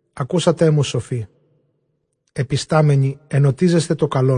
Ἀκούσατέ μου σοφοὶ, ἐπιστάμενοι ἐνωτίζεσθε.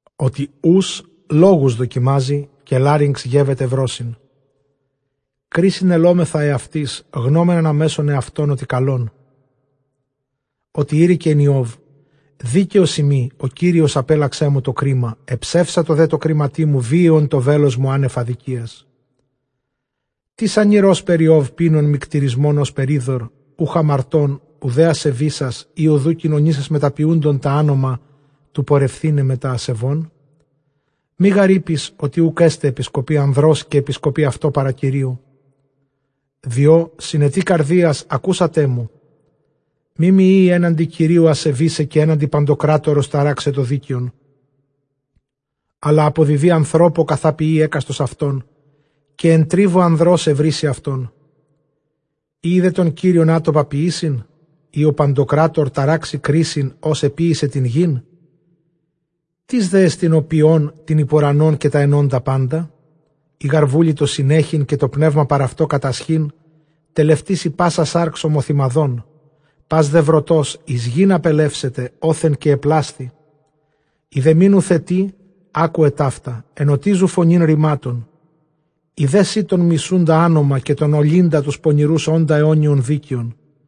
Ὅτι οὖς λόγους δοκιμάζει, καὶ λάρυγξ γεύεται βρῶσιν. Κρίσιν ἑλώμεθα ἑαυτοῖς, γνῶμεν ἀναμέσον ἑαυτῶν, ὅ, τι καλόν. Ὅτι εἴρηκεν Ἰὼβ, δίκαιός εἰμι· ὁ Κύριος ἀπήλλαξέ μου τὸ κρίμα. Ἐψεύσατο δὲ τῷ κρίματί μου, βίαιον τὸ βέλος μου ἄνευ ἀδικίας. Τίς ἀνὴρ ὥσπερ Ἰὼβ, πίνων μυκτηρισμὸν ὥσπερ ὕδωρ; Οὐχ ἁμαρτῶν οὐδὲ ἀσεβήσας, ἢ οὐδʼ οὐ κοινωνήσας μετὰ ποιούντων τὰ ἄνομα, τοῦ πορευθῆναι μετὰ ἀσεβῶν. Μὴ γὰρ εἴπῃς, ὅτι οὐκ ἔσται ἐπισκοπὴ ἀνδρός, καὶ ἐπισκοπὴ αὐτῷ παρὰ Κυρίου. Διὸ συνετοὶ καρδίας ἀκούσατέ μου, μή μοι εἴη ἔναντι Κυρίου ἀσεβῆσαι, καὶ ἔναντι παντοκράτορος ταράξαι τὸ δίκαιον. Ἀλλὰ ἀποδιδοῖ ἀνθρώπῳ καθὰ ποιεῖ ἕκαστος αὐτῶν, καὶ ἐν τρίβῳ ἀνδρὸς εὑρήσει αὐτόν. Οἴει δὲ τὸν Κύριον ἄτοπα ποιήσειν, ἢ ὁ παντοκράτωρ ταράξει κρίσιν, ὃς ἐποίησε τὴν γῆν; Τίς δέ ἐστιν ὁ ποιῶν τὴν ὑπʼ οὐρανὸν, καὶ τὰ ἐνόντα πάντα; Εἰ γὰρ βούλοιτο συνέχειν, καὶ τὸ σνεῦμα παρʼ αὐτῷ κατασχεῖν, τελευτήσει πᾶσα σὰρξ ὁμοθυμαδὸν, πᾶς δὲ βροτὸς εἰς γῆν ἀπελεύσεται, ὅθεν καὶ ἐπλάσθη. Ἴδὲ μὴ νουθετῇ, ἄκουε ταῦτα, ἐνωτίζου φωνὴν ῥημάτων. Ἴδε σὺ τὸν μισοῦντα ἄνομα, καὶ τὸν ὀλλύντα τοὺς πονηροὺς, ὄντα αἰώνιον δίκαιον.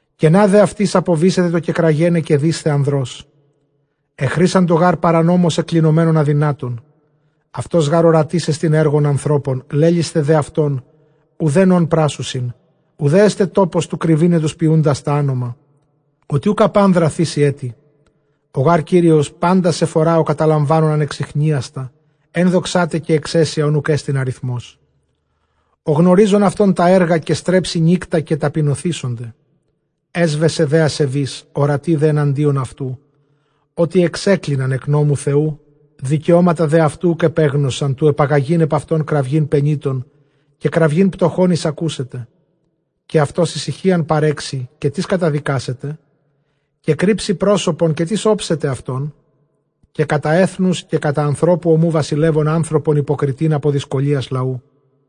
Κενὰ δὲ αὐτοῖς ἀποβήσεται, τὸ κεκραγέναι καὶ δεῖσθαι ἀνδρός· ἐχρήσαντο γὰρ παρανόμως, ἐκκλινομένων ἀδυνάτων. Αὐτὸς γὰρ ὁρατής ἐστιν ἔργων ἀνθρώπων, λέληθε δὲ αὐτὸν οὐδὲν ὧν πράσσουσιν. Οὐδὲ ἔσται τόπος τοῦ κρυβῆναι τοὺς ποιοῦντας τὰ ἄνομα· Ὅτι οὐκ ἐπʼ ἄνδρα θήσει ἔτι. Ὁ γὰρ Κύριος πάντας ἐφορᾷ· ὁ καταλαμβάνων ἀνεξιχνίαστα, ἔνδοξά τε καὶ ἐξαίσια, ὧν οὐκ ἔστιν ἀριθμός. Ὁ γνωρίζων αὐτῶν τὰ ἔργα, καὶ στρέψει νύκτα καὶ ταπεινωθήσοται. Ἔσβεσε δὲ ἀσεβεῖς, ὁρατοὶ δὲ ἐναντίον αὐτοῦ. Ὅτι ἐξέκλιναν ἐκ νόμου Θεοῦ, δικαιώματα δὲ αὐτοῦ οὐκ ἐπέγνωσαν, τοῦ ἐπαγαγεῖν ἐπʼ αὐτὸν κραυγὴν πενήτων, καὶ κραυγὴν πτωχῶν εἰσακούσεται. Καὶ αὐτὸς ἡσυχίαν παρέξει, καὶ τίς καταδικάσεται; καὶ κρύψει πρόσωπον, καὶ τίς ὄψεται αὐτόν; καὶ κατὰ ἔθνους, καὶ κατὰ ἀνθρώπου ὁμοῦ. Βασιλεύων ἀνθρωπον ὑποκριτὴν ἀπὸ δυσκολίας λαοῦ.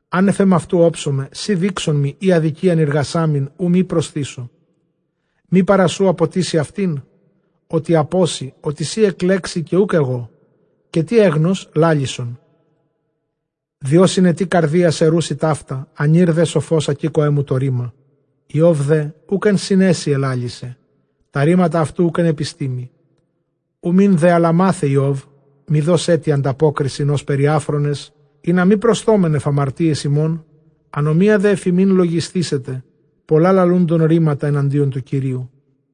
Ἄνευ ἐμαυτοῦ ὄψομαι· σὺ δεῖξόν μοι, εἰ ἀδικίαν εἰργασάμην, οὐ μὴ προσθήσω. Μὴ ἀπὸ σοῦ ἀποτίσει αὐτὴν, ὅτι σὺ ἀπώσῃ; ὅτι σὺ ἐκλέξῃ καὶ οὐκ ἐγώ; καὶ τί ἔγνως, λάλησον. Διὸ συνετοὶ καρδίας ἐροῦσι ταῦτα, ἀνὴρ δὲ σοφὸς ἀκήκοέ μου τὸ ῥῆμα. Ἰὼβ δὲ οὐκ ἐν συνέσει ἐλάλησε, τὰ ῥήματα αὐτοῦ οὐκ ἐν ἐπιστήμῃ. Οὐ μὴν δὲ ἀλλὰ μάθε Ἰώβ, μὴ δῷς ἔτι ἀνταπόκρισιν ὥσπερ οἱ ἄφρονες· Ἵνα μὴ προσθῶμεν ἐφʼ ἁμαρτίας ἡμῶν, ἀνομία δὲ ἐφʼ ἡμῖν λογισθήσεται, πολλὰ λαλούντων ῥήματα ἐναντίον τοῦ Κυρίου.